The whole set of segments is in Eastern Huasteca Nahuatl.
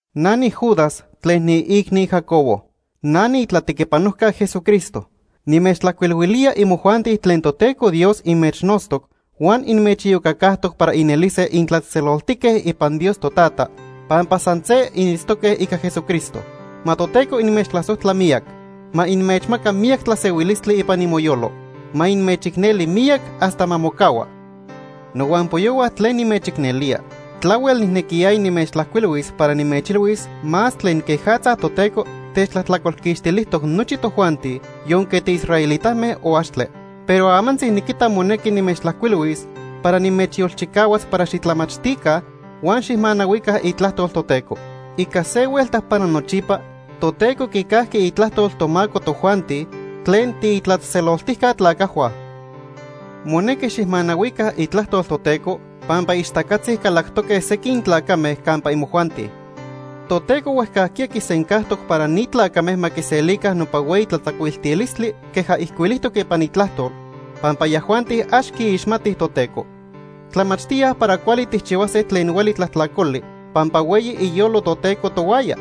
Na niJudas tlen niiicni Jacobo. Na niitlatequipanojca Jesucristo. Nimechtlajcuilhuilía imojuanti tlen Toteco Dios inmechnotztoc huan inmechiyocacajtoc para inelise intlatzejtzeloltique ipan Dios Totata pampa san se initztoque ica Jesucristo. Ma Toteco inmechtlasojtla miyac. Ma inmechmaca miyac tlasehuilistli ipan imoyolo. Ma inmechicneli miyac hasta ma mocahua. Nohuampoyohua tlen nimechicnelía, tlahuel nijnequiyaya nimechtlajcuilhuis para nimechilhuis más tlen quejatza Toteco techtlajtlacolquixtilijtoc nochi tojuanti yonque tiisraelitame o axtle. Pero amantzi niquita monequi nimechtlajcuilhuis para nimechyolchicahuas para xitlamachtica huan xijmanahuica itlajtol Toteco. Ica se huelta para nochipa Toteco quicajqui itlajtol tomaco tojuanti tlen tiitlatzejtzeloltijca tlacajhua. Monequi xijmanahuica itlajtol Toteco pampa ixtacatzi calactoque sequin tlacame campa imojuanti. Toteco huejcajquiya quisencajtoc para ni tlacame ma quiselica nopa hueyi tlatzacuiltilistli queja ijcuilijtoc ipan Itlajtol, pampa yajuanti ax quiixmatij Toteco. Tlamachtíaj para cuali tijchihuase tlen hueli tlajtlacoli pampa hueyi iyolo Toteco tohuaya.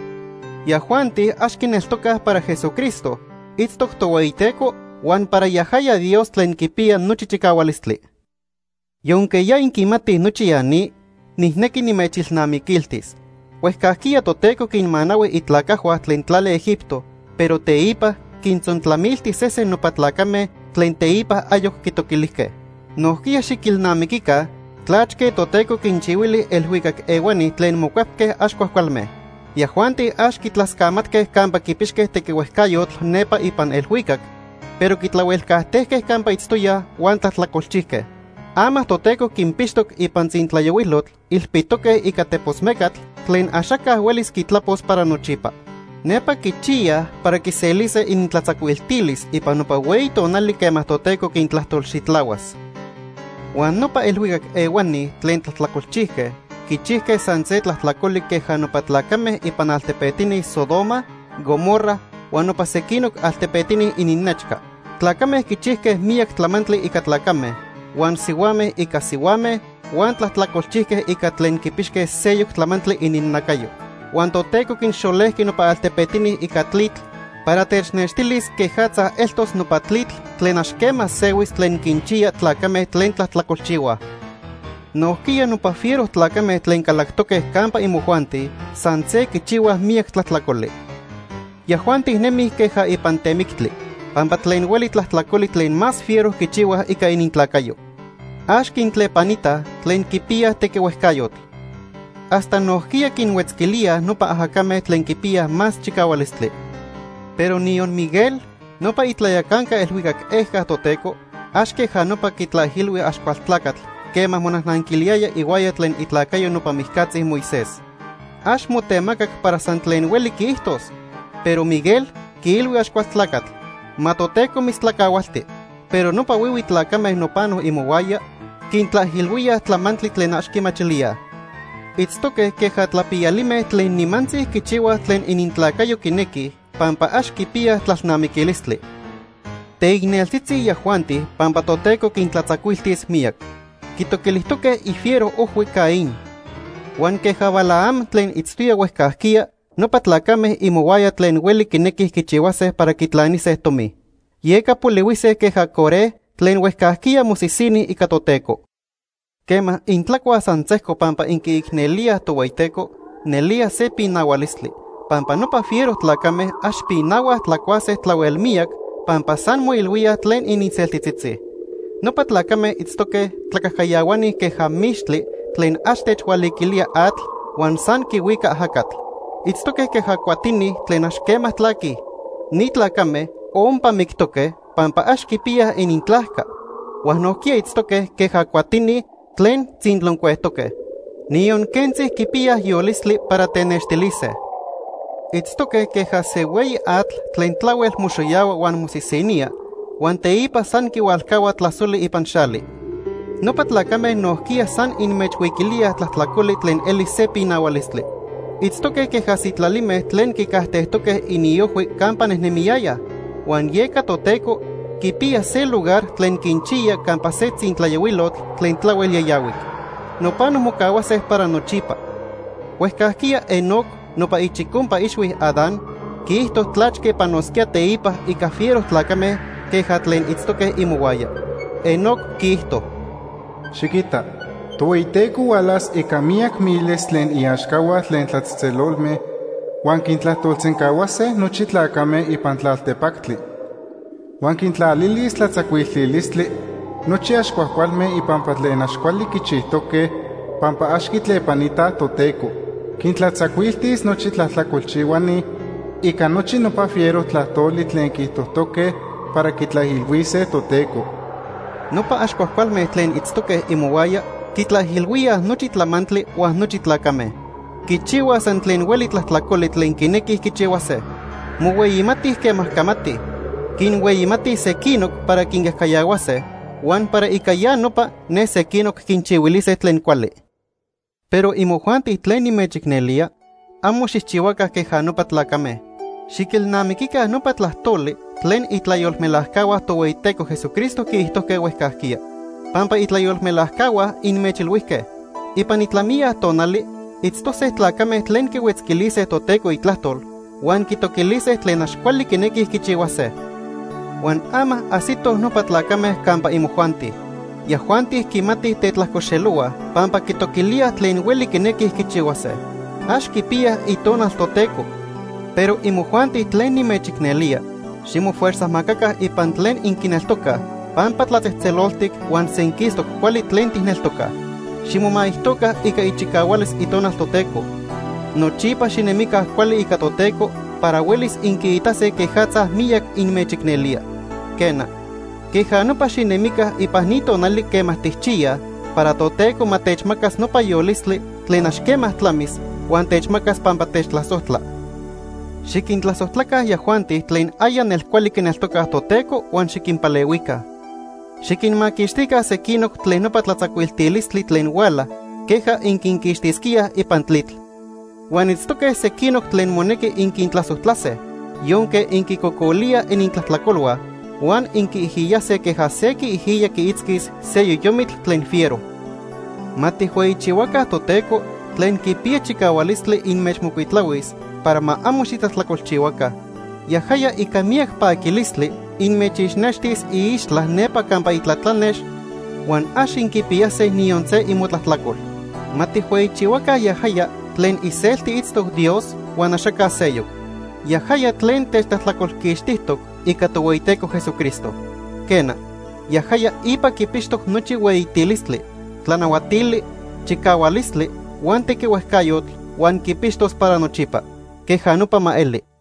Yajuanti ax quineltocaj para Jesucristo itztoc Tohueyiteco huan para yajaya Dios tlen Quipiya Nochi Chicahualistli. Yonque ya inquimatij nochi ya ni, nijnequi nimechilnamiquiltis. Huejcajquiya Toteco quinmanahui itlacajhua tlen tlali Egipto, pero teipa quintzontlamilti sesen nopa tlacame tlen teipa ayoc quitoquilijque. Nojquiya xiquilnamiquica tlachque Toteco quinchihuili elhuicac ehuani tlen mocuepque ax cuajcualme. Yajuanti ax quitlascamatque campa quipixque tequihuejcayotl nepa ipan elhuicac, pero quitlahuelcajtejque campa itztoyaj huan tlajtlacolchijque. Ama Toteco quinpixtoc ipan tzintlayohuilotl ilpitoque ica tepos mecatl tlen axaca huelis quitlapos para nochipa. Nepa quichiyaj para quiselise inintlatzacuiltilis ipan nopa hueyi tonali quema Toteco quintlajtolxitlahuas. Huan nopa elhuicac ehuani tlen tlajtlacolchijque quichijque san se tlajtlacoli queja nopa tlacame ipan altepetini Sodoma, Gomorra huan nopa sequinoc altepetini ininnechca. Tlacame quichijque miyac tlamantli ica tlacame, huan sihuame ica sihuame huan tlajtlacolchijque ica tlen quipixque seyoc tlamantli ininnacayo. Huan Toteco quinxolejqui nopa altepetini ica tlitl para technextilis quejatza eltos nopa tlitl tlen ax quema sehuis tlen quinchiya tlacame tlen tlajtlacolchihuaj. Nojquiya nopa fiero tlacame tlen calactoque campa imojuanti san se quichihuaj miyac tlajtlacoli. Yajuanti nemij queja ipan temictli, pampa tlen hueli tlajtlacoli tlen más fiero quichihuaj ica inintlacayo. Ax quintlepanitaj tlen quipiyaj tequihuejcayotl. Hasta nojquiya quinhuetzquilíaj nopa ajacame tlen quipiyaj más chicahualistli. Pero niyon Miguel, nopa itlayacanca elhuicac ejca Toteco, ax queja nopa quitlaijilhui Axcualtlacatl quema monajnanquiliyaya ihuaya tlen itlacayo nopa mijcatzi Moisés. Ax motemacac para san tlen hueli quiijtos, pero Miguel quiilhui Axcualtlacatl: “Ma Toteco mitztlacahualti.” Pero nopa huihui tlacame nopano imohuaya quintlaijilhuíaj tlamantli tlen ax quimachilíaj. Itztoque queja tlapiyalime tlen nimantzi quichihuaj tlen inintlacayo quinequij pampa ax quipiyaj tlalnamiquilistli. Teicneltzitzi yajuanti pampa Toteco quintlatzacuiltis miyac. Quitoquilijtoque ifiero ojhui Caín. Huan queja Balaam tlen itztoya huejcajquiya, nopa tlacame imohuaya tlen hueli quinequij quichihuase para quitlanise tomi. Yeca polihuise queja Coré tlen huejcajquiya mosisini ica Toteco. Quema intlacuaj san sejco pampa inquiicnelíaj Tohueyiteco, nelía se pinahualistli, pampa nopa fiero tlacame ax pinahuaj tlacuase tlahuel miyac pampa san moilhuíaj tlen ininseltitzitzi. Nopa tlacame itztoque tlacajcayahuani queja mixtli tlen ax techhualiquilía atl huan san quihuica ajacatl. Itztoque queja cuatini tlen ax quema tlaquij. Ni tlacame ompa mictoque pampa ax quipiyaj inintlajca, huan nojquiya itztoque queja cuatini tlen tzinloncuejtoque. Niyon quentzi quipiyaj yolistli para tenextilise. Itztoque queja se hueyi atl tlen tlahuel moxoyahua huan mosisinía huan teipa san quihualcahua tlasoli ipan xali. Nopa tlacame nojquiya san inmechhuiquilíaj tlajtlacoli tlen eli se pinahualistli. Itztoque queja sitlalime tlen quicajtejtoque iniojhui campa nejnemiyayaj, huan yeca Toteco quipiya se lugar tlen quinchiya campa se tzintlayohuilotl tlen tlahuel yayahuic. Nopano mocahuase para nochipa. Huejcajquiya Enoc nopa ichicompa ixhui Adán quiijto tlachque panosquía teipa ica fiero tlacame queja tlen itztoque imohuaya. Enoc quiijto: “Xiquita, Tohueyiteco hualas ica miyac miles tlen iaxcahua tlen tlatzejtzelolme, huan quintlajtolsencahuase nochi tlacame ipan tlaltepactli. Huan quintlalilis tlatzacuiltilistli nochi ax cuajcualme ipampa tlen ax cuali quichijtoque pampa ax quitlepanitaj Toteco. Quintlatzacuiltis nochi tlajtlacolchihuani ica nochi nopa fiero tlajtoli tlen quiijtojtoque para quitlaijilhuise Toteco.” Nopa ax cuajcualme tlen itztoque imohuaya quitlaijilhuíaj nochi tlamantli huan nochi tlacame. Quichihuaj san tlen hueli tlajtlacoli tlen quinequij quichihuase. Mohueyimatij quema camatij. Quinhueyimatij sequinoc para quincajcayahuase, huan para ica ya nopa, ne sequinoc quinchihuilise tlen cuali. Pero imojuanti tlen nimechicnelía, amo xijchihuaca queja nopa tlacame. Xiquilnamiquica nopa tlajtoli tlen itlayolmelajcahua Tohueyiteco Jesucristo quiijtojque huejcajquiya. Pampa itlayolmelajcahua inmechilhuijque: “Ipan itlamiya tonali itztose tlacame tlen quihuetzquilise Toteco Itlajtol huan quitoquilise tlen ax cuali quinequij quichihuase.” Huan ama ajsitoj nopa tlacame campa imojuanti. Yajuanti quimatij tetlajcoxelohuaj pampa quitoquilíaj tlen hueli quinequij quichihuase. Ax quipiyaj Itonal Toteco. Pero imojuanti tlen nimechicnelía, ximofuerzajmacaca ipan tlen inquineltocaj pampa tlatzejtzeloltic huan senquistoc cuali tlen tijneltocaj. Ximomaijtoca ica ichicahualis Itonal Toteco. Nochipa xinemica cuali ica Toteco para huelis inquiitase quejatza miyac inmechicnelía. Quena, queja nopa xinemica ipan ni tonali quema tijchiyaj para Toteco ma techmacas nopa yolistli tlen ax quema tlamis huan techmacas pampa techtlasojtla. Xiquintlasojtlaca yajuanti tlen aya nelcuali quineltocaj Toteco huan xiquinpalehuica. Xiquinmaquixtica sequinoc tlen nopa tlatzacuiltilistli tlen huala queja inquinquixtisquíaj ipan tlitl. Huan itztoque sequinoc tlen monequi inquintlasojtlase, yonque inquicocolíaj inintlajtlacolhua, huan inquiijiyase queja se quiijiya quiitzquis se yoyomitl tlen fiero. Ma tijhueyichihuaca Toteco tlen quipiya chicahualistli inmechmocuitlahuis para ma amo xitlajtlacolchihuaca. Yajaya ica miyac paquilistli inmechixnextis iixtla nepa campa itlatlanex huan ax inquipiyase niyon se imotlajtlacol. Ma tijhueyichihuaca yajaya tlen iselti itztoc Dios huan axaca seyoc. Yajaya tlen techtlajtlacolquixtijtoc ica Tohueyiteco Jesucristo. Quena, yajaya ipa quipixtoc nochi hueyitilistli, tlanahuatili, chicahualistli huan tequihuejcayotl, huan quipixtos para nochipa. Queja nopa ma eli.